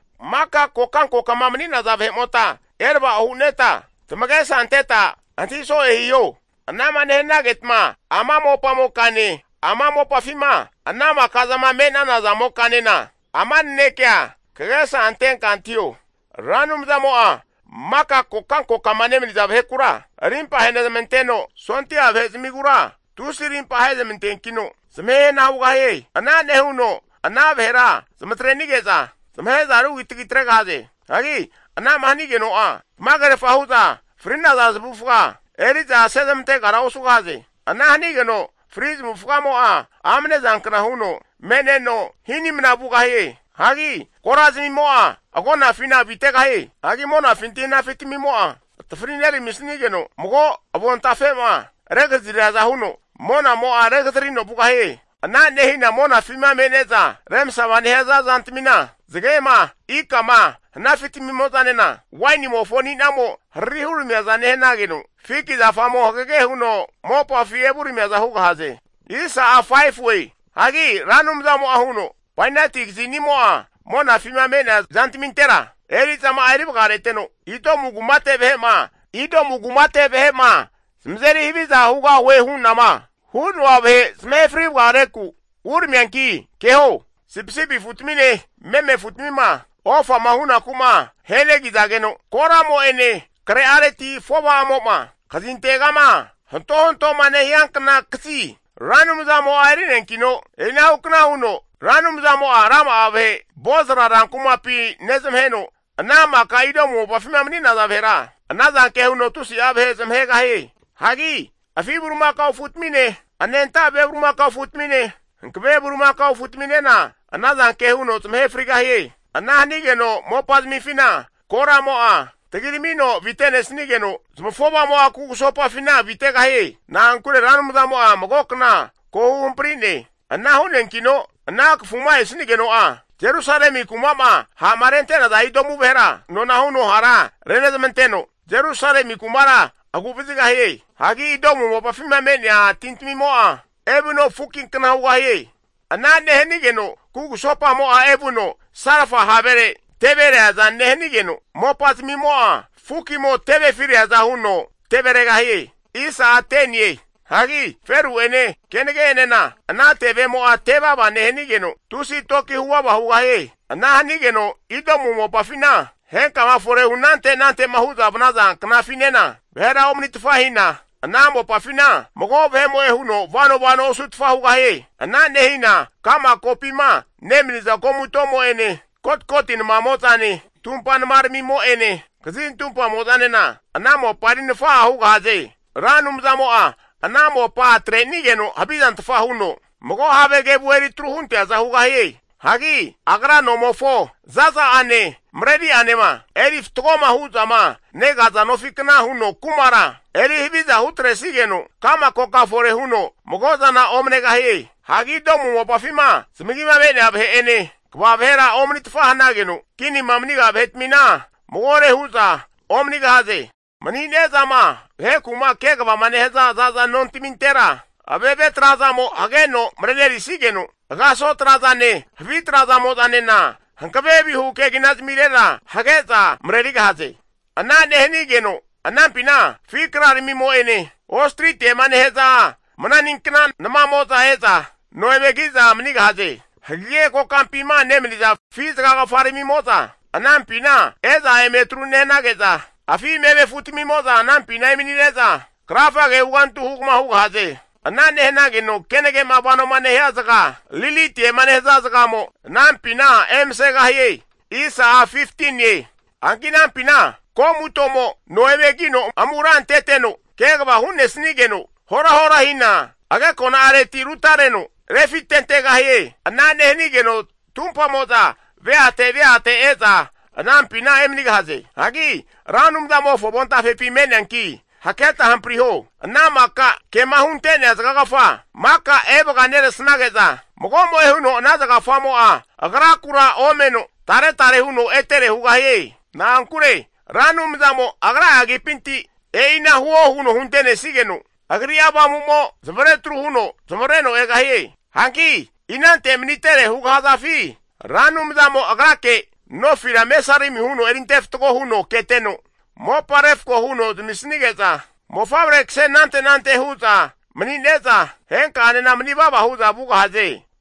Maka kokankokama mani'naza vahe'mota erava'o hu'neta tamagesa anteta antahi so'e hiho. Anama nehanagetma ama mopamokane, ama mopafima ana maka'zama me'nana zamokanena ama nanekea kagesa antenka antahio. Ra Anumzamo'a maka kokankokama nemaniza vahekura rimpa ahenezamanteno, sondia vahezmigura tusi arimpa ahezmanteankino, zamahe hana hugahie. Ana nehuno ana vahera zamatrenige'za zamahe'za rugitagi atregahaze. Hagi anama hanigeno'a tamagerfa hu'za fri'naza zamavufaga eri'za asezmantegara osugahie. Ana hanigeno fri zamavufagamo'a amne zankna huno me'neno hinimna vugahie. Hagi korazamimo'a agonafina avitegahie. Hagi monafinti hanafi tamimo'a atafari neramisnigeno, mago avontafe'ma regazariaza huno monamo'a regazarino vugahie. Ana nehina monafima me'ne'za remsama nehaza zantamina, zagema ikama hanafi tamimo'zanena, wainimofo ani'namo harari huramiaza nehanigeno, fiki zafamo hagege huno mopafi evuramiaza hugahaze. Hagi Ra Anumzamo'a huno, Bainati kazinimo'a monafima me'nea zantamintera eri'zama'a eri vagareteno, Edomu kumate vahe'ma zamazeri haviza hugahue hu'nama hu'noa vahe zamahe fri vagareku uramianki keho. Sipisipi afutamine meme afutmima ofama hunaku'ma ahenegizageno, koramo'ene kre'areti afo'va'amo'ma kazintegama hantohantoma nehiankna kazi Ra Anumzamo'a eri'neankino, e'inahukna huno Ra Anumzamo'a rama'a vahe Bozra rankumapi nezmaheno ana maka Edomu mopafima mani'naza vahera ana zanke huno tusi'a vahe zamahegahie. Hagi afi bulimakao afutamine, anenta ve bulimakao afutamine, hankave bulimakao afutaminena ana zanke huno zamahe frigahie. Ana hanigeno mopazmifina koramo'a tagiramino avinetesnigeno, zamafova'amo'a kugusopafina avitegahie. Na'ankure Ra Anumzamo'a mago kna ko huhampri'ne. Ana hu'neankino ana kafuma esanigeno'a, Jerusalemi kuma'ma ha'ma rente'naza Idomu vahera nona huno hara renezmanteno, (Saioni) Jerusalemi kumara agu'vazigahie. Hagi Idomu mopafima me'nea tintamimo'a evuno fukinkna hugahie. Ana nehanigeno kugusopamo'a evuno salfa havere teve reaza nehanigeno, mopazamimo'a fukimo tevefi reaza huno teveregahie. Hagi feru'ene kenage enena ana tevemo'a tevava nehanigeno, tusi toki huvava hugahie. Ana hanigeno Idomu mopafina henkama fore hu anante anante'ma hu'za vanaza knafinena vahera omanitfa hina, ana mopafina mago vahe'mo'e huno vano vano osutfa hugahie. Ana nehina ka'ma kopima nemaniza komutomo'ene, kotkoti namamo'zane tumpa namaramimo'ene kazin tumpamo'zanena ana mopa eri nafa'a hugahaze. Ra Anumzamo'a ana mopa atreni'geno havizantfa huno, mago have kevu eri tru hunteaza hugahie. Hagi agra nomofo za'za'ane mareri'anema eri fatgoma hu'zama negaza nofikna huno kumara eri haviza hutresigeno ka'ma koka fore huno mago'zana omanegahie. Hagi Idomu mopafima zamagima me'nea vahe'ene kva vahe'enena omanitfa hanageno, kinima maniga vahetamina magore hu'za omanigahaze. Mani'nezama vaheku'ma kegavama nehaza zaza nontamintera ave've trazaramimo hageno marenerisigeno, agaso trazane havi tra'zamo'zanena hankave vihu keginazmirera hage'za marerigahaze. Ana nehanigeno anampina afi kraramimo'ene ostretiema nehaza mananinkna namamo'za e'za no eme ki'za manigahaze. Hagege kokampima nemaniza afi zagagafaramimo'za, anampina e'za eme atru nehanage'za, afi meme afutamimo'za anampina emani'neza krafage hugantu hugama hugahaze. Ana nehanageno kenage'ma vanoma nehia zaga lilitiema nehaza zagamo anampina emasegahie. Hanki anampina ko'mutomo no eme kino amura anteteno kegava hu'nesnigeno, horahora hina agekona'areti rutareno refitentegahie. Ana nehanigeno tumpamo'za veate veate e'za anampina emanigahaze. Hagi Ra Anumzamofo avontafepi me'neanki haketa hampriho. Ana maka kema hunte'nea zagagafa maka evaga neresnage'za, mago'mo'e huno ana zagagafamo'a agrakura omeno, tare tare huno etere hugahie. Na'ankure Ra Anumzamo agra'a agipinti e'ina huo huno huntesnigeno, Agri'a Avamu'mo zamavare atru huno zamavareno egahie. Hanki inante manitere hugahazafi, Ra Anumzamo Agrake nofira mesarimi huno erinte fatgo huno keteno mopa refko huno zamisnige'za, mofavre kase anante anante hu'za mani'neza henka'anena mani vava hu'za vugahaze.